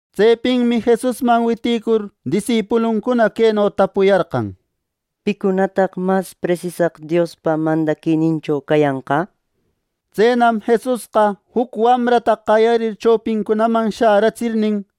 Tsepinmi Jesusman witïcur disipuluncuna queno tapuyarqan: —¿Picunataq mas presisaq Diospa mandaquinincho cayanqa? —nir. Tsenam Jesusqa juc wamrata qayarir, chopincunaman sharätsirnin,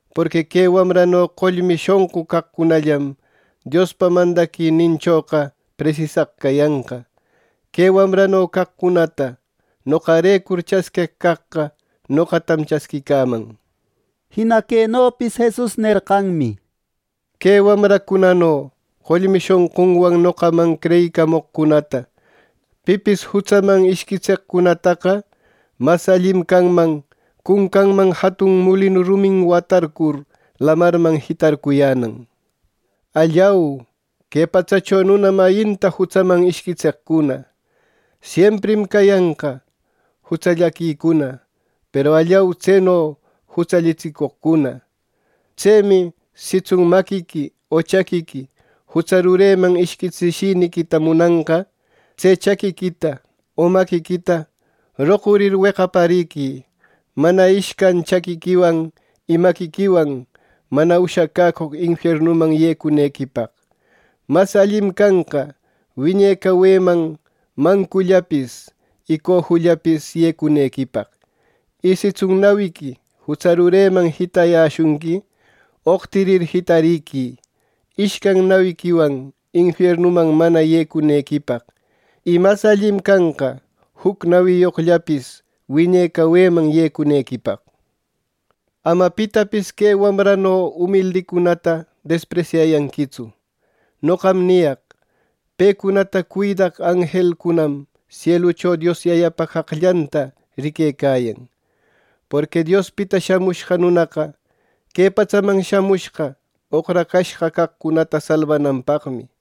Porqui que wamrano qollmi shonqu caqcunallam, Diospa mandaquininchoqa presisaq cayanqa. Que wamrano caqcunata noqarecur chasqueq caqqa, noqatam chasquicaman —nir. Jina quenopis Jesus nerqanmi: “Que wamracunano qollmi shonqunwan noqaman creyicamoqcunata pipis jutsaman ishquitseqcunataqa, mas allim canman cuncanman jatun mulinu rumin watarcur, lamarman jitarcuyänan. ¡Allau! ¡Que patsacho nuna mayinta jutsaman ishquitseqcuna! Siemprim cayanqa jutsallaquicuna; peru ¡Allau, tseno jutsallatsicoqcuna! “Tsemi, sitsun maquiqui o chaquiqui jutsa rureman ishquitsishiniquita munanqa, tse chaquiquita y maquiquita roqurir, weqapariqui mana ishcan chaquiquiwan y maquiquiwan mana ushacäcoq infiernuman yecunequipaq. Mas allim canqa wiñe caweman mancullapis y cojullapis yecunequipaq. Y sitsun nawiqui jutsa rureman jitayäshunqui, oqtirir jitariquï, ishcan nawiquiwan infiernuman mana yecunequipaq; y mas allim canqa juc nawiyoqllapis wiñe caweman yecunequipaq. “Ama pitapis que wamrano umildicunata despresyayanquitsu. Noqam niyaq: Pecunata cuidaq anjelcunam sielucho Dios Yayäpa qaqllanta riquecayan. ˻Porqui Diospita Shamushqa Nunaqa que patsaman shamushqa oqracashqa caqcunata salbananpaqmi.˼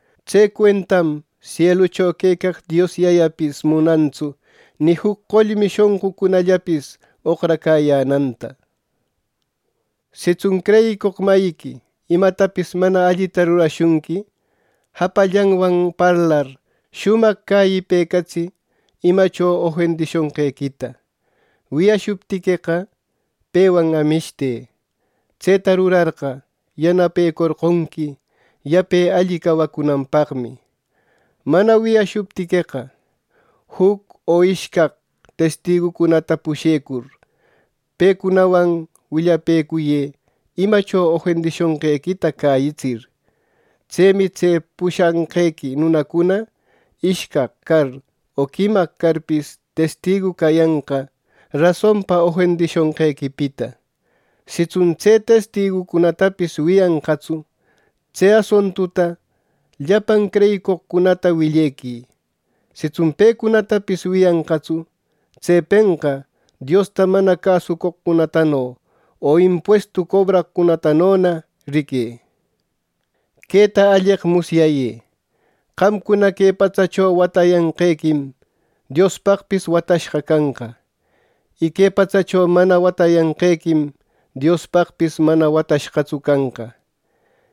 Tse cuentam sielucho quecaq Dios Yayapis munantsu ni juc qollmi shonqucunallapis oqracäyänanta. “Sitsun creyicoq mayiqui imatapis mana allita rurashunqui, japallanwan parlar, shumaq cäyipecatsï imacho ofendishonqequita. Wiyashuptiqueqa, pewan amishtë. Tseta rurarqa, yanapecorqonqui yape alli cawacunanpaqmi. Mana wiyashuptiqueqa, juc o ishcaq testigucunata pushecur, pecunawan willapëcuyë imacho ofendishonqequita cäyitsir. Tsemi tse pushanqequi nunacuna ishcaq car o quimaq carpis testigu cayanqa rasonpa ofendishonqequipita. Sitsun tse testigucunatapis wiyanqatsu, tse asuntuta llapan creyicoqcunata willequï; sitsun pecunatapis wiyanqatsu, tsepenqa Diosta mana cäsucoqcunatano o impuestu cobracoqcunatanona riquë. “Queta alleq musyayë: Qamcuna que patsacho watäyanqequim, Diospaqpis watashqa canqa; y que patsacho mana watäyanqequim Diospaqpis mana watashqatsu canqa.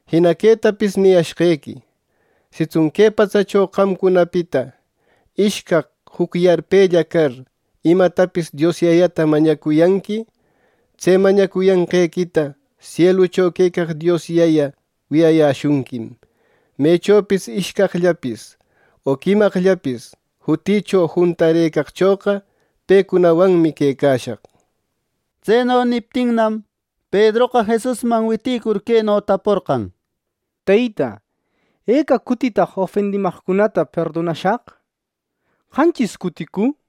“Jina quetapis niyashqequi: Sitsun que patsacho qamcunapita ishcaq juc yarpella car imatapis Dios Yayäta mañacuyanqui, tse mañacuyanqequita sielucho quecaq Dios Yayä wiyayäshunquim. Mechopis ishcaqllapis o quimaqllapis jutïcho juntarëcaqchoqa, pecunawanmi quecashaq.” Tseno niptinnam, Pedroqa Jesusman witïcur queno taporqan: —Teyta, ¿eca cutitaq ofendimaqcunata perdonashaq? ¿Qanchis cuticu? —nir.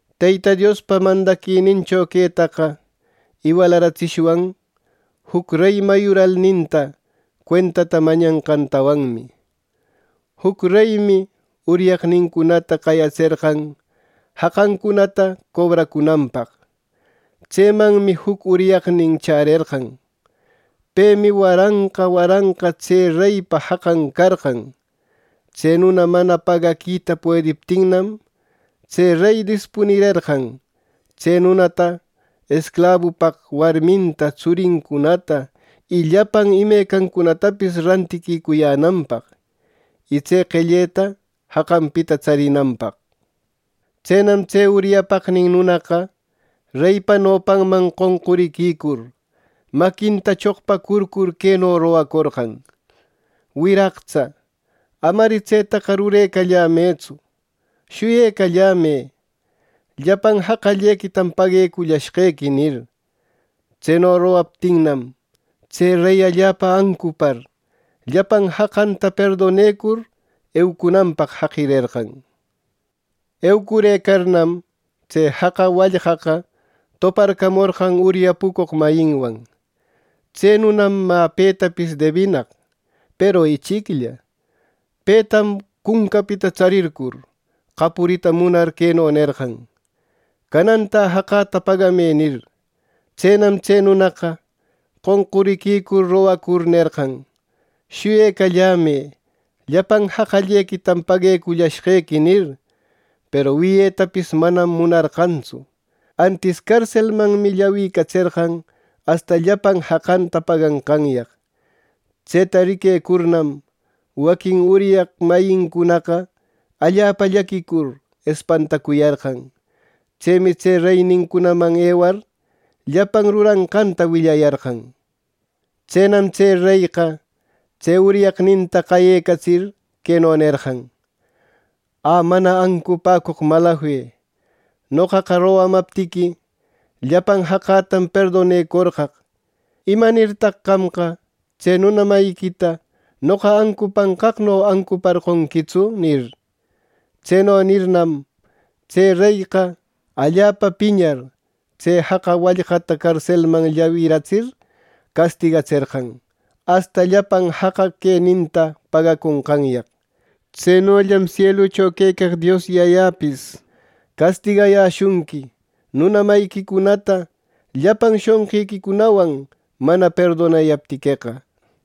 “Teyta Diospa mandaquinincho quetaqa iwalaratsishwan: Juc rey mayuralninta cuentata mañaqtawanmi. Juc reymi uryaqnincunata qayatserqan jaqancunata cobracunanpaq. Tsemanmi juc uryaqnin chärerqan. Pemi waranqa waranqa tse reypa jaqan carqan. Tse nuna mana pagaquita puediptinnam, tse rey dispunirerqan, tse nunata esclabupaq, warminta, tsurincunata y llapan imecancunatapis rantiquicuyänanpaq, y tse qelleta jaqanpita tsarinanpaq. Tsenam tse uryapaqnin nunaqa reypa nopanman qonquriquicur, maquinta choqpacurcur queno rogacorqan: ‘¡Wiraqtsa, amari tsetaqa rurecallämëtsu. Shuyecallämë, llapan jaqallequitam pagallashqequi!’ nir. Tseno rogaptinnam, tse rey allapa ancupar llapan jaqanta perdonecur, eucunanpaq jaqirerqan. “Eucurëcarnam, tse jaqa wallqaqa toparcamorqan uryapucoq mayinwan. Tse nunam mä petapis debinaq, peru ichiclla. Petam cuncapita tsarircur, qapurita munar queno nerqan: ‘¡Canantä jaqäta pagamë!’ nir. Tsenam tse nunaqa, qonquriquicur rogacur nerqan, ‘¡Shuyecallämë, llapan jaqallequitam paguecullashqequi!’ nir. Peru wiyetapis manam munarqantsu; antis carselmanmi llawicatserqan asta llapan jaqanta paganqanyaq. Tseta riquecurnam, waquin uryaq mayincunaqa allapa llaquicur espantacuyarqan. Tsemi tse reynincunaman ewar, llapan ruranqanta willayarqan. Tsenam reyqa tse uryaqninta qayecatsir, queno nerqan: ‘¡Ä, mana ancupäcoq malafe! Noqaqa rogamaptiqui, llapan jaqätam perdonecorqaq. ¿Imanirtaq qamqa tse nuna mayiquita noqa ancupanqaqno ancuparqonquitsu!’ nir. Tseno nirirnam, tse reyqa allapa piñar, tse jaqa wallqata carselman llawiratsir castigatserqan, asta llapan jaqa queninta pagaconqanyaq. Tsenollam sielucho quecaq Dios Yayäpis castigayäshunqui nuna mayiquicunata llapan shonqiquicunawan mana perdonayaptiqueqa” nir.